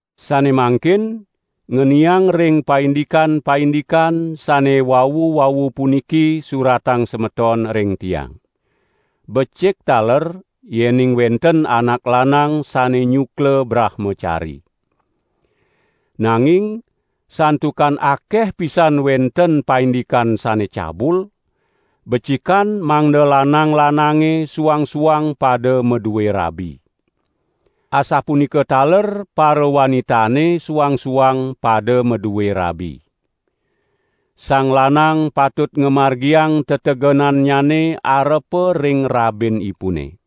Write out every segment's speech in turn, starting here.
Sane mangkin ngeniang ring paindikan-paindikan sane wau-wau puniki suratang semeton ring tiang. Becik taler yening wenten anak lanang sane nyukla brahmacari. Nanging santukan akeh pisan wenten paindikan sane cabul, becikan mangda lanang-lanange suang-suang pada madue rabi. Asapunika taler parawanitane suang-suang pada madue rabi. Sang lanang patut ngamargiang tetegenannyane arepa ring rabinipune.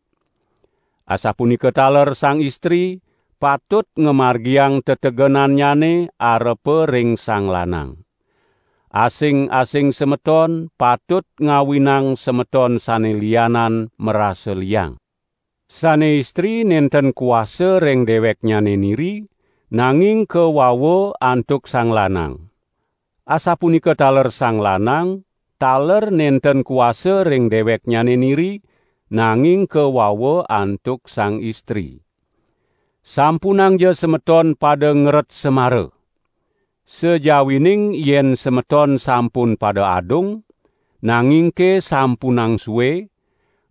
Asapunika taler sang istri patut ngamargiang tetegenannyane arepa ring sang lanang. Asing-asing semeton patut ngawinang semeton sane lianan marasa liang. Sane istri nenten kuasa ring deweknyane niri, nanging kawawa antuk sang lanang. Asapunika taler sang lanang, taler nenten kuasa ring deweknyane niri, nanging kawawa antuk sang istri. Sampunangja semeton pada ngeret semara! Sajawining yen semeton sampun pada adung, nangingke sampunang sue,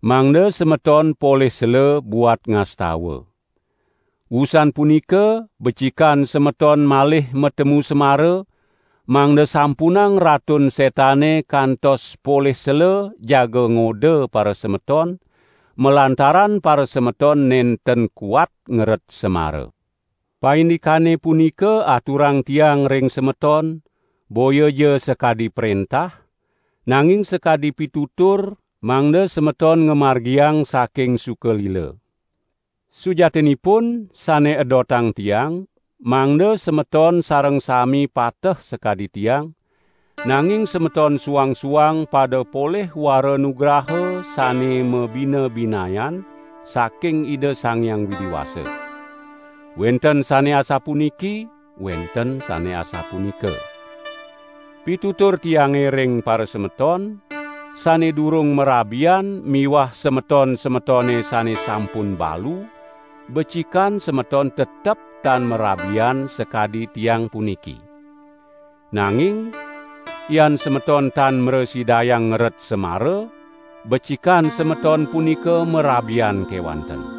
mangda semeton polih sela buat ngastawa. Wusan punika becikan semeton malih matemu semara, mangda sampunang Ratun Setane kantos polih sela jaga ngoda parasemeton, malantaran parasemeton nenten kuat ngeret semara. Paindikane punika aturang tiang ring semeton boyaja sakadi prentah, nanging sakadi pitutur, mangda semeton ngamargiang saking suka lila. Sujatinipun sane edotang tiang mangda semeton sareng sami pateh sakadi tiang; nanging semeton suang-suang pada polih wara nugraha sane mabinabinayan saking Ida Sang Hyang Widi Wasa. Wenten sane asapuniki, wenten sane asapunika. Pitutur tiange ring parasemeton sane durung marabian miwah semeton-semetone sane sampun balu, becikan semeton tetep tan marabian sakadi tiang puniki. Nanging yan semeton tan mrasidayang ngeret semara, becikan semeton punika marabian kewanten.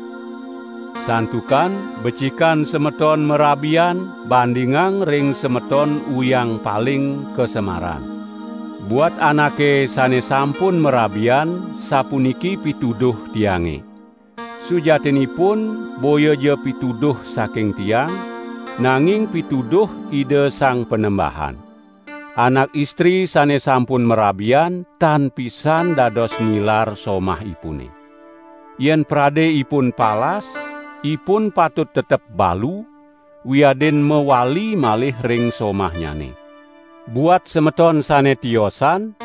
Santukan becikan semeton marabian bandingang ring semeton uyang paling kasemaran. Buat anake sane sampun marabian sapuniki pituduh tiange. Sujatinipun boyaja pituduh saking tiang, nanging pituduh Ida Sang Panembahan. Anak istri sane sampun marabian tan pisan dados nilar somahipune. Yen prade ipun palas, ipun patut tetep balu, wiadin mawali malih ring somahnyane. Buat semeton sane tiosan,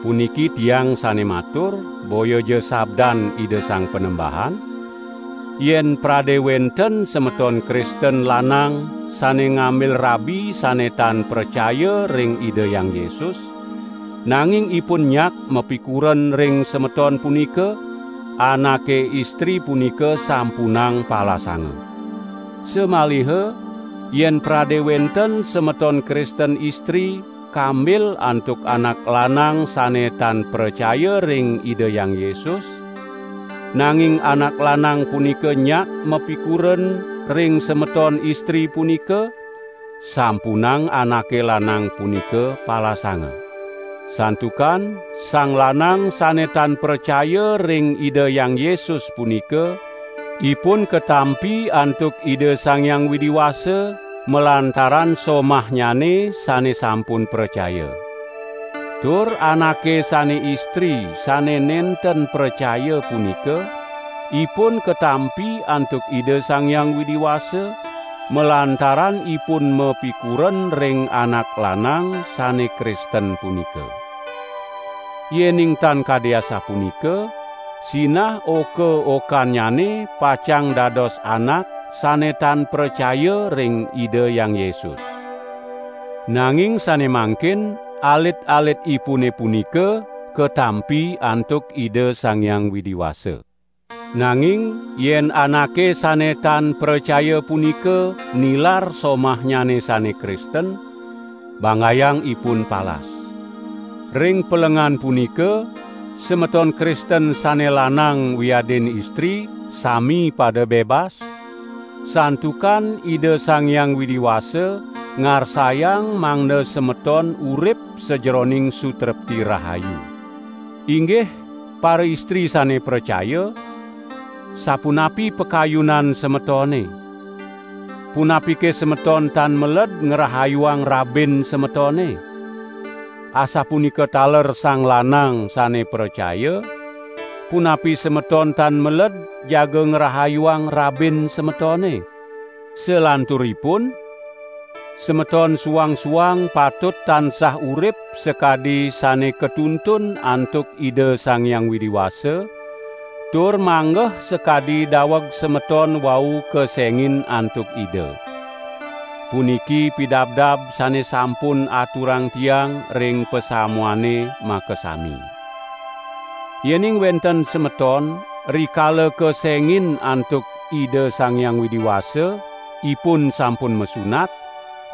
(puniki tiang sane matur, boyaja sabdan Ida Sang Panembahan), yen prade wenten semeton Kristen lanang sane ngambil rabi sane tan pracaya ring Ida Hyang Yesus, nanging ipun nyak mapikuren ring semeton punika, anake istri punika sampunang palasanga. Samaliha yen prade wenten semeton Kristen istri kambil antuk anak lanang sane tan pracaya ring Ida Hyang Yesus, nanging anak lanang punika nyak mapikuren ring semeton istri punika, sampunang anake lanang punika palasanga. Santukan sang lanang sane tan pracaya ring Ida Hyang Yesus punika, ipun katampi antuk Ida Sang Hyang Widi Wasa malantaran somahnyane sane sampun pracaya. Tur anake sane istri sane nenten pracaya punika, ipun katampi antuk Ida Sang Hyang Widi Wasa, malantaran ipun mapikuren ring anak lanang sane Kristen punika. Yening tan kadi asapunika, sinah oka-okannyane pacang dados anak sane tan pracaya ring Ida Hyang Yesus. Nanging sane mangkin alit-alitipune punika katampi antuk Ida Sang Hyang Widi Wasa. Nanging yen anake sane tan pracaya punika nilar somahnyane sane Kristen, banggayang ipun palas. Ring pelengan punika, semeton Kristen sane lanang wiadin istri sami pada bebas, santukan Ida Sang Hyang Widi Wasa ngarsayang mangda semeton urip sajeroning sutrepti rahayu. Inggih paraistri sane pracaya, sapunapi pakayunan semetone, punapike semeton tan meled ngrahayuang rabin semetone? Asapunika taler sang lanang sane pracaya, punapi semeton tan meled jaga ngrahayuang rabin semetone? Salanturipun, semeton suang-suang patut tansah urip sakadi sane katuntun antuk Ida Sang Hyang Widi Wasa, tur manggeh sakadi daweg semeton wau kesengin antuk Ida. Puniki pidabdab sane sampun aturang tiang ring pasamuane makasami. Yening wenten semeton, rikala kesengin antuk Ida Sang Hyang Widi Wasa, ipun sampun masunat,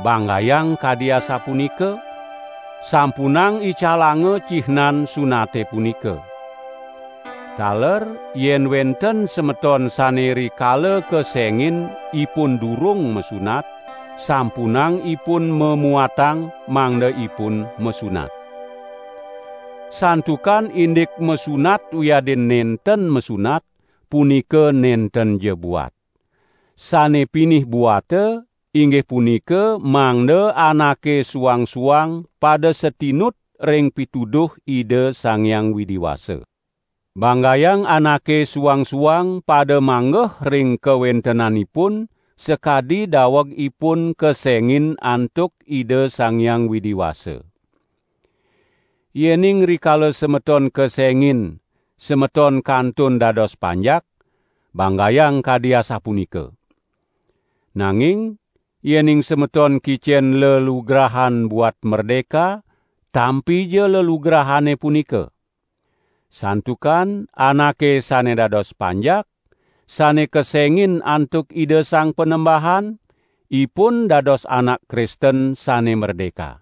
banggayang kadi asapunika, sampunang icalanga cihnan sunate punika. Taler yen wenten semeton sane rikala kesengin ipun durung masunat, sampunang ipun mamuatang mangda ipun masunat. Santukan indik masunat wiadin nenten masunat, punika nentenja buat. Sane pinih buata inggih punika mangda anake suang-suang pada satinut ring pituduh Ida Sang Hyang Widi Wasa. Banggayang anake suang-suang pada manggeh ring kawentenanipun sakadi daweg ipun kesengin antuk Ida Sang Hyang Widi Wasa. Yening rikala semeton kesengin, semeton kantun dados panjak, banggayang kadi asapunika! Nanging yening semeton kicen lelugrahan buat merdeka, tampija lelugrahane punika. Santukan anake sane dados panjak, sane kesengin antuk Ida Sang Panembahan, ipun dados anak Kristen sane merdeka.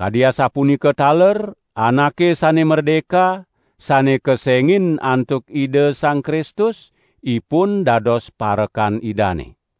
Kadi asapunika taler anake sane merdeka sane kesengin antuk Ida Sang Kristus, ipun dados parekan Idane.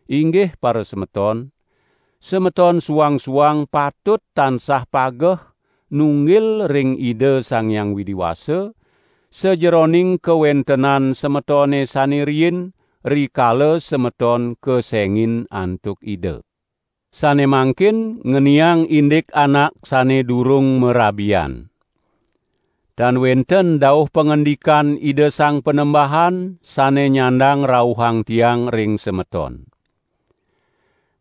Inggih parasemeton, semeton suang-suang patut tansah pageh nunggil ring Ida Sang Hyang Widi Wasa, sajeroning kawentenan semetone sane riin rikala semeton kesengin antuk Ida. Sane mangkin ngeniang indik anak sane durung marabian. Tan wenten dauh pangandikan Ida Sang Panembahan sane nyandang rauhang tiang ring semeton.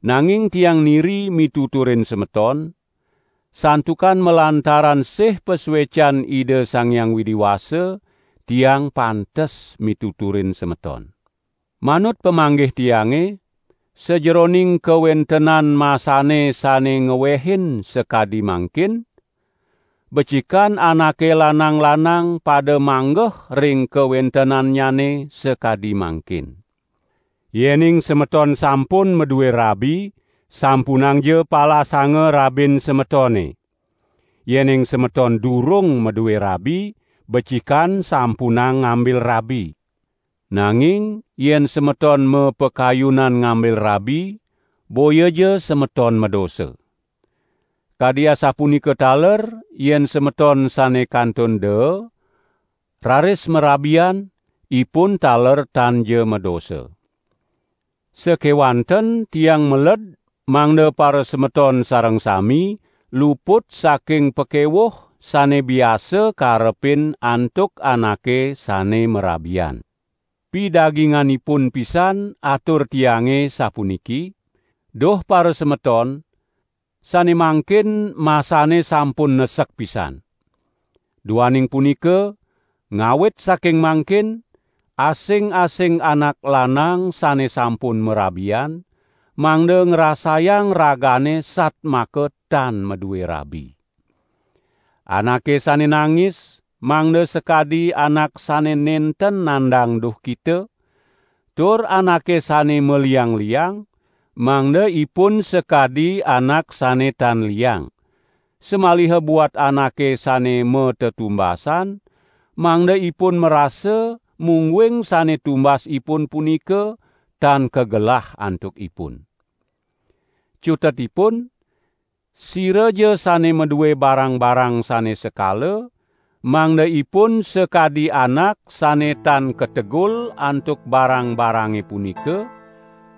Nanging tiang niri mituturin semeton, santukan malantaran sih pasuecan Ida Sang Hyang Widi Wasa, tiang pantes mituturin semeton. Manut pamanggih tiange, sajeroning kawentenan masane sane ngewehin sakadi mangkin, becikan anake lanang-lanang pada manggeh ring kawentenannyane sakadi mangkin. Yening semeton sampun madue rabi, sampunangja palasanga rabin semetone. Yening semeton durung madue rabi, becikan sampunang ngambil rabi. Nanging yen semeton mapakayunan ngambil rabi, boyaja semeton madosa. Kadi asapunika taler yen semeton sane kantun daa, raris marabian, ipun taler tanja madosa. Sakewanten tiang meled mangda parasemeton sareng sami luput saking pakewuh sane biasa karepin antuk anake sane marabian. Pidaginganipun pisan atur tiange sapuniki: Duh parasemeton, sane mangkin masane sampun nesek pisan! Duaning punika, ngawit saking mangkin, asing-asing anak lanang sane sampun marabian, mangda ngrasayang ragane satmaka tan madue rabi. Anake sane nangis, mangda sakadi anak sane nenten nandang duhkita, tur anake sane maliang-liang, mangda ipun sakadi anak sane tan liang, samaliha buat anake sane matetumbasan, mangda ipun marasa mungguing sane tumbas ipun punika tan kagelah antukipun. Cutetipun siraja sane madue barang-barang sane sekala, mangda ipun sakadi anak sane tan kategul antuk barang-barange punika,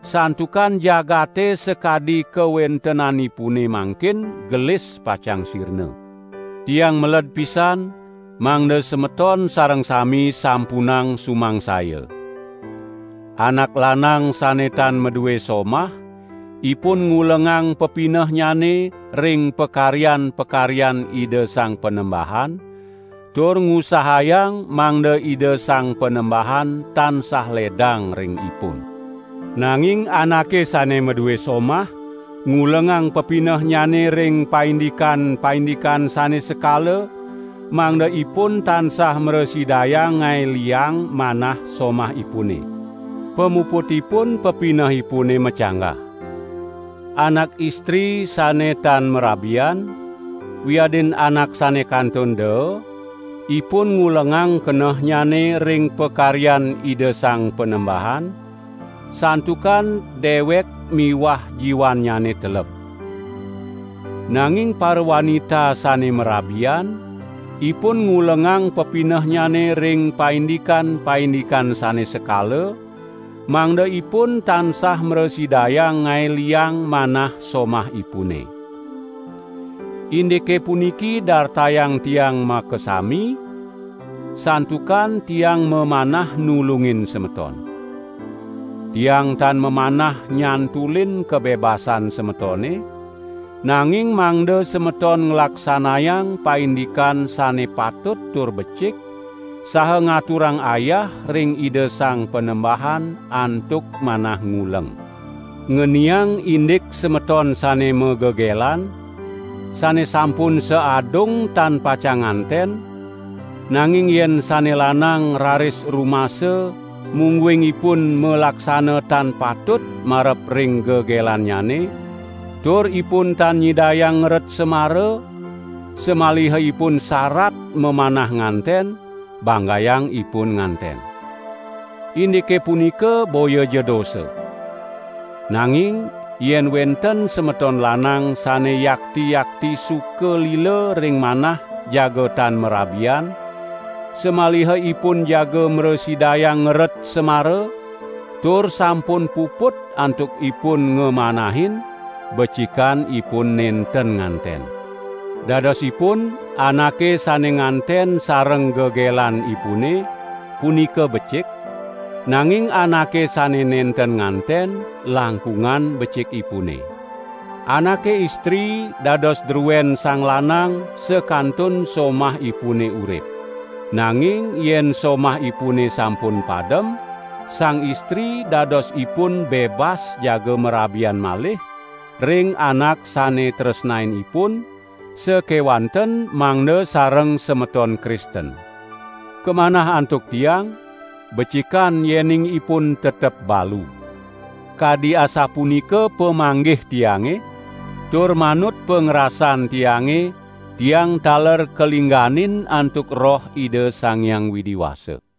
santukan jagate sakadi kawentenanipune mangkin gelis pacang sirna. Tiang meled pisan mangda semeton sareng sami sampunang sumangsaya. Anak lanang sane tan madue somah, ipun ngulengang pepinehnyane ring pakaryan-pakaryan Ida Sang Panembahan, tur ngusahayang mangda Ida Sang Panembahan tansah ledang ring ipun. Nanging anake sane madue somah ngulengang pepinehnyane ring paindikan-paindikan sane sekala mangda ipun tansah mrasidayang ngae liang manah somahipune. Pamuputipun, pepinehipune macanggah. Anak istri sane tan marabian, wiadin anak sane kantun daa, ipun ngulengang kenehnyane ring pakaryan Ida Sang Panembahan, santukan dewek miwah jiwannyane teleb. Nanging parawanita sane marabian, ipun ngulengang pepinehnyane ring paindikan-paindikan sane sekala, mangda ipun tansah mrasidayang ngae liang manah somahipune. Indike puniki dartayang tiang makasami, santukan tiang mamanah nulungin semeton. Tiang tan mamanah nyantulin kabebasan semetone, nanging mangda semeton nglaksanayang paindikan sane patut tur becik, saha ngaturang ayah ring Ida Sang Panembahan antuk manah nguleng. Ngeniang indik semeton sane magegelan, sane sampun saadung tan pacang nganten, nanging yen sane lanang raris rumasa mungguing ipun malaksana tan patut marep ring gegelannyane, tur ipun tan nyidayang ngeret semara, samaliha ipun sarat mamanah nganten, banggayang ipun nganten. Indike punika boyaja dosa. Nanging yen wenten semeton lanang sane yakti-yakti suka lila ring manah jaga tan marabian, samaliha ipun jaga mrasidayang ngeret semara, tur sampun puput antuk ipun ngamanahin, becikan ipun nenten nganten. Dadosipun anake sane nganten sareng gegelanipune, punika becik, nanging anake sane nenten nganten, langkungan becikipune. Anake istri, dados druen sang lanang sakantun somahipune urip. Nanging yen somahipune sampun padem, sang istri dadosipun bebas jaga marabian malih, ring anak sane tresnain ipun, sakewanten mangda sareng semeton Kristen. Kamanah antuk tiang, becikan yening ipun tetep balu. Kadi asapunika pamanggih tiange, tur manut pangrasan tiange, tiang taler kalingganin antuk Roh Ida Sang Hyang Widi Wasa.